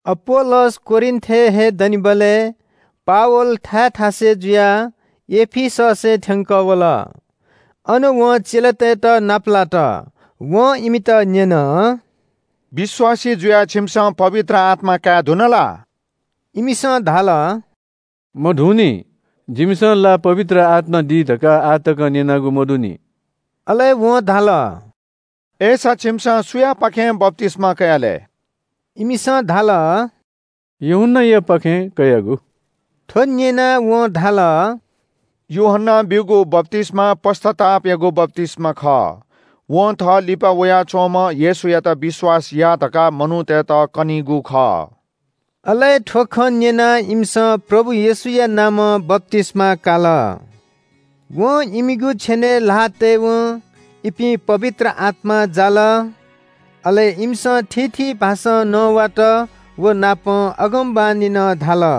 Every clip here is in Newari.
अपोल्‍लोस कोरिन्‍थय् हे दनिबलय् पावल थाय् थासय् जुयाः एफिससय् थ्‍यंकः वल। अन वं चेलातय्‌त नापलात। वं इमित न्‍यन – “विश्‍वासी जुयाः छिमिसं पवित्र आत्‍मा काये धुन ला?” इमिसं धाल – “मधुंनि। जिमिसं ला पवित्र आत्‍मा दी धकाः आः तकं न्‍यनागु मदुनि।” अले वं धाल – “अय्‌सा छिमिसं सुयापाखें बप्‍तिस्‍मा कयाः लय्?” इमिसं धाल – “यूहन्‍नायापाखें कयागु।” थ्‍व न्‍यनाः वं धाल – “यूहन्‍नां ब्‍यूगु बप्‍तिस्‍मा पश्‍चातापयागु बप्‍तिस्‍मा खः। वं थः लिपा वयाच्‍वंम्‍ह येशूयात विश्‍वास याः धकाः मनूतय्‌त कनीगु खः।” अले थ्‍व खँ न्‍यनाः इमिसं प्रभु येशूया नामं बप्‍तिस्‍मा काल। वं इमिगु छेनय् ल्‍हाः तयेवं इपिं पवित्र आत्‍मां जाल। अले इमिसं थीथी भाषां नवात वनापं अगमवाणी नं धाल।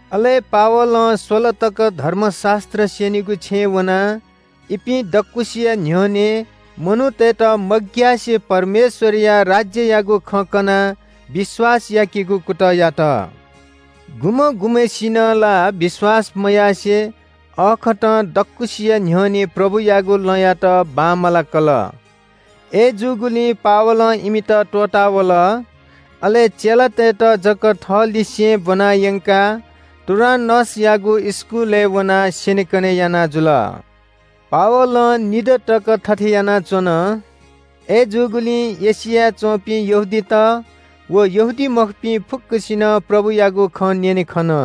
अले पावलं स्‍वला तक धर्मशास्‍त्र स्‍यनीगु छेँय् वनाः इपिं दक्‍वसिया न्‍ह्यःने मनूतय्‌त मग्‍यासे परमेश्‍वरया राज्‍ययागु खँ कनाः विश्‍वास याकेगु कुतः यात। गुम्‍हं गुम्‍हय्‌सिनं ला विश्‍वास मयासें अःखतं दक्‍वसिया न्‍ह्यःने प्रभुयागु लँयात बांमलाकल। अय्‌जूगुलिं पावलं इमित त्‍वःता वल। अले चेलातय्‌त जक थःलिसें ब्‍वना यंकाः टुरान्‍नसयागु इस्‍कुलय् वनाः स्‍यनेकने याना जुल। पावलं निदँ तक थथे यानाच्‍वन। अय्‌जूगुलिं एशियाय् च्‍वंपिं यहूदीत व यहूदीमखुपिं फुक्‍कसिनं प्रभुयागु खँ न्‍यने खन।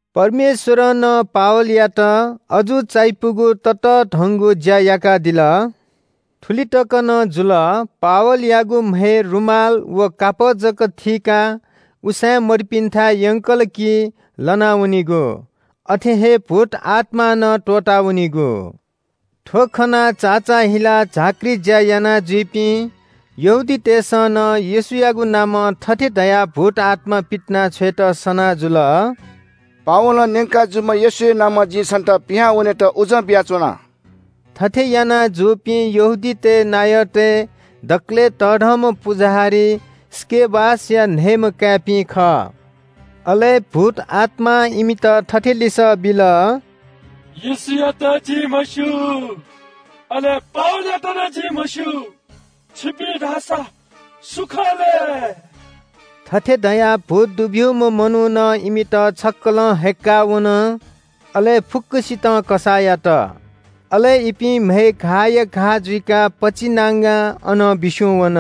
परमेश्‍वरं नं पावलयात अजू चायापुगु ततःधंगु ज्‍या याकादिल। थुलि तक नं जुल, पावलयागु म्‍हय् रुमाल व कापः जक थीकाः उसाँय्‌मदुपिन्‍थाय् यंकल कि लना वनीगु। अथे हे भूतआत्‍मां नं त्‍वःता वनीगु। थ्‍व खनाः चाचाःहिलाः झाँक्री ज्‍या यानाजुइपिं यहूदीतय्‌सं नं येशूयागु नामं थथे धयाः भूतआत्‍मा पितिनाछ्वयेत सना जुल – “पावलं न्‍यंका जूम्‍ह येशूया नामं जिं छन्‍त पिहां वनेत उजं बियाच्‍वना।” थथे याना जूपिं यहूदीतय् नायःतय् दकलय् तःधंम्‍ह पुजाहारी स्‍केवासया न्‍हय्‌म्‍ह काय्‌पिं खः। अले भूतआत्‍मां इमित थथे लिसः बिल – “येशूयात जिं म्‍हस्‍यू, अले पावलयात नं जिं म्‍हस्‍यू। छिपिं धाःसा सु खः लय्?” थथे धयाः भूत दुब्‍यूम्‍ह मनुखं इमित छक्‍कलं हय्‌क्‍का वन, अले फुक्‍कसितं कसाः यात। अले इपिं म्‍हय् घाःया घाः जुइकाः पचिनांगां अनं बिस्‍युं वन।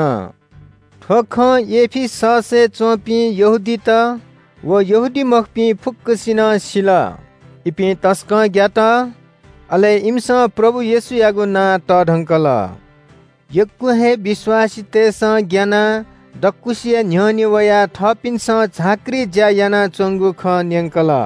थ्‍व खँ एफिससय् च्‍वंपिं यहूदीत व यहूदीमखुपिं फुक्‍कसिनं सिल। इपिं तसकं ग्‍यात। अले इमिसं प्रभु येशूयागु नां तःधंकल। यक्‍व हे विश्‍वासीतय्‌सं ग्‍यानाः दक्‍वसिया न्‍ह्यःने वयाः थःपिन्‍सं झाँक्री ज्‍या यानाच्‍वंगु खँ न्‍यंकल।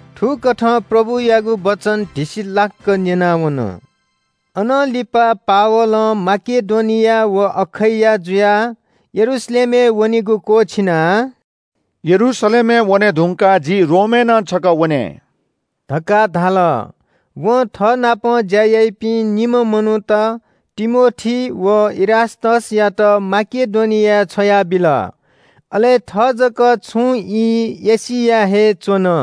थुकथं प्रभुयागु वचन धिसिलाक्‍क न्‍यनावन। अनं लिपा पावलं माकेडोनिया व अखैया जुयाः यरूशलेमय् वनेगु क्‍वःछिनाः – “यरूशलेमय् वने धुंकाः जि रोमय् नं छकः वने” धकाः धाल। वं थःनाप ज्‍या याइपिं निम्‍ह मनूत तिमोथी व इरास्‍तसयात माकेडोनियाय् छ्वयाबिल। अले थः जक छुं ई एशियाय् हे च्‍वन।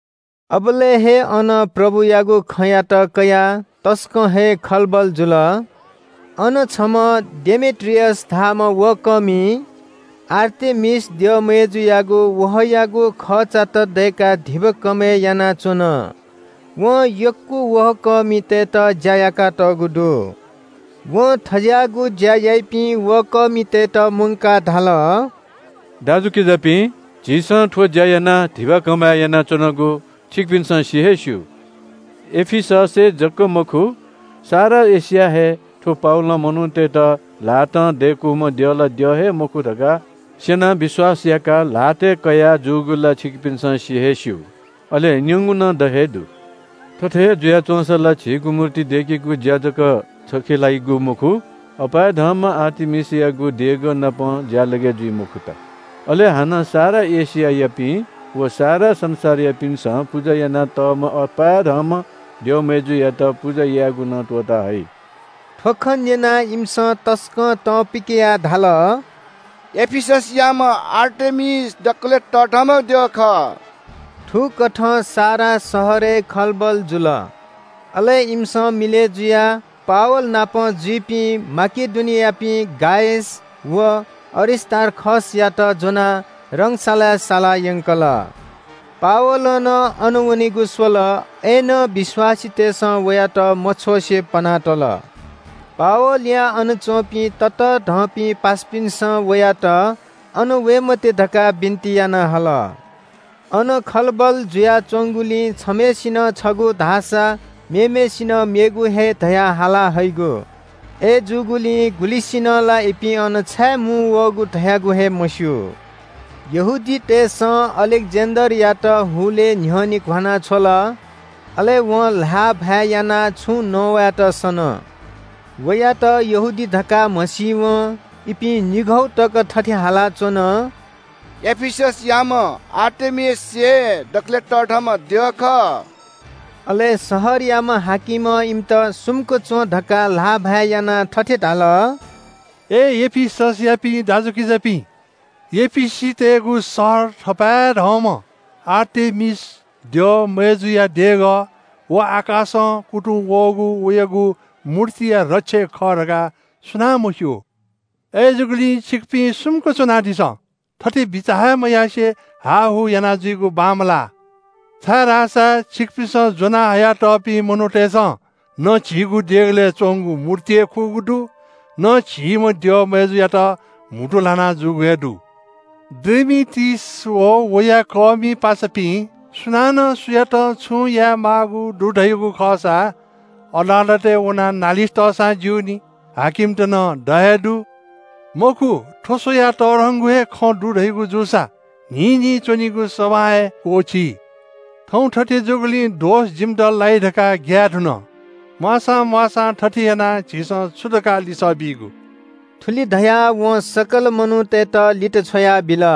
अबलय् हे अन प्रभुयागु खँयात कयाः तसकं हे खलबल जुल। अन छम्‍ह डेमेत्रियस धाःम्‍ह वहः कःमिं आर्तेमिस द्यःमय्‌जुयागु वहःयागु खःचात दय्‌काः धिबा कमय् यानाच्‍वन। वं यक्‍व वहःकःमितय्‌त ज्‍या याकातःगु दु। वं थज्‍याःगु ज्‍या याइपिं वहःकःमितय्‌त मुंकाः धाल – “दाजुकिजापिं, झीसं थ्‍व ज्‍या यानाः धिबा कमय् यानाच्‍वनागु छिकपिन्‍सं सि हे स्‍यू। एफिससय् जक मखु, सारा एशियाय् हे थ्‍व पावलं मनूतय्‌त ल्‍हातं दय्‌कूम्‍ह द्यः ला द्यः हे मखु धकाः स्‍यनाः विश्‍वास याकाः ल्‍हातय्‌ कया जूगु ला छिकपिन्‍सं सि हे स्‍यू, अले न्‍यंगु नं द हे दु। थथे हे जुया च्‍वंसा ला झीगु मूर्ति दय्‌केगु ज्‍या जक छखे लाइगु मखु, अपाय्‌धंम्‍ह आर्तेमिसयागु देगःनापं ज्‍यालगय् जुइ मखुत। अले हानं सारा एशियायापिं व सारा संसारयापिन्‍सं पुजा यानातःम्‍ह अपाय्‌धंम्‍ह द्यःमय्‌जुयात पुजा यायेगु नं त्‍वःता हइ।” थ्‍व खँ न्‍यनाः इमिसं तसकं तं पिकयाः धाल – “एफिससयाम्‍ह आर्तेमिस दकलय् तःधंम्‍ह द्यः खः।” थुकथं सारा शहरय् खलबल जुल। अले इमिसं मिलय् जुयाः पावल नाप जुइपिं माकेडोनियायापिं गायस व अरिस्‍तार्खसयात ज्‍वनाः रंगशालाय् साला यंकल। पावलं नं अन वनेगु स्‍वत, अय्‌नं विश्‍वासीतय्‌सं वयात मछ्वसे पना तल। पावलया अन च्‍वंपिं ततःधंपिं पासापिन्‍सं वयात अन वये मते धकाः बिन्‍ति याना हल। अन खलबल जुयाच्‍वंगुलिं छम्‍हय्‌सिनं छगू धाःसा मेम्‍हय्‌सिनं मेगु हे धयाः हाला हइगु। अय्‌जूगुलिं गुलिसिनं ला इपिं अन छाये मुंवःगु धयागु हे मस्‍यू। यहूदीतय्‌सं अलेक्‍जेन्‍डरयात हुलय् न्‍ह्यःने घ्‍वाना छ्वल। अले वं ल्‍हाःभाय् यानाः छुं नवायेत सन। वयात यहूदी धकाः म्‍हसीवं इपिं निघौ तक थथे हालाच्‍वन – “एफिससयाम्‍ह आर्तेमिस हे दकलय् तःधंम्‍ह द्यः खः।” अले शहरयाम्‍ह हाकिमं इमित सुम्‍क च्‍वं धकाः ल्‍हाःभाय् यानाः थथे धाल – “अय् एफिससयापिं दाजुकिजापिं, एफिसीतय्‌गु शहर थपाय्‌धंम्‍ह आर्तेमिस द्यःमय्‌जुया देगः व आकाशं कुतुं वःगु वयागु मूर्तिया रक्षक खः धकाः सुनां मस्‍यू? अय्‌जूगुलिं छिकपिं सुम्‍क च्‍वनादिसँ, थथे बिचाः हे मयासें हाःहू यानाजुइगु बांमलाः, छाय्‌धाःसा छिकपिन्‍सं ज्‍वना हयातःपिं मनूतय्‌सं न झीगु देगलय् च्‍वंगु मूर्ति हे खुगू दु, न झीम्‍ह द्यःमय्‌जुयात म्‍हुतु ल्‍हाना जूगु हे दु। “डेमेत्रियस व वया ज्‍याकःमि पासापिं सुनानं सुयातं छुं यायेमाःगु दु धयागु खःसा अदालतय् वनाः नालिस तःसां ज्‍यूनि। हाकिमत नं द हे दु। मखु थ्‍व स्‍वयाः तःधंगु हे खँ दु धयागु जूसा न्‍हिं न्‍हिं च्‍वनीगु सभां हे क्‍वःछी। थौं थथे जूगुलिं दोष जिमित लाइ धकाः ग्‍याये धुन। म्‍वाःसां म्‍वाःसां थथे यानाः झीसं छु धकाः लिसः बीगु?” थुलि धयाः वं सकल मनूतय्‌त लित छ्वयाबिल।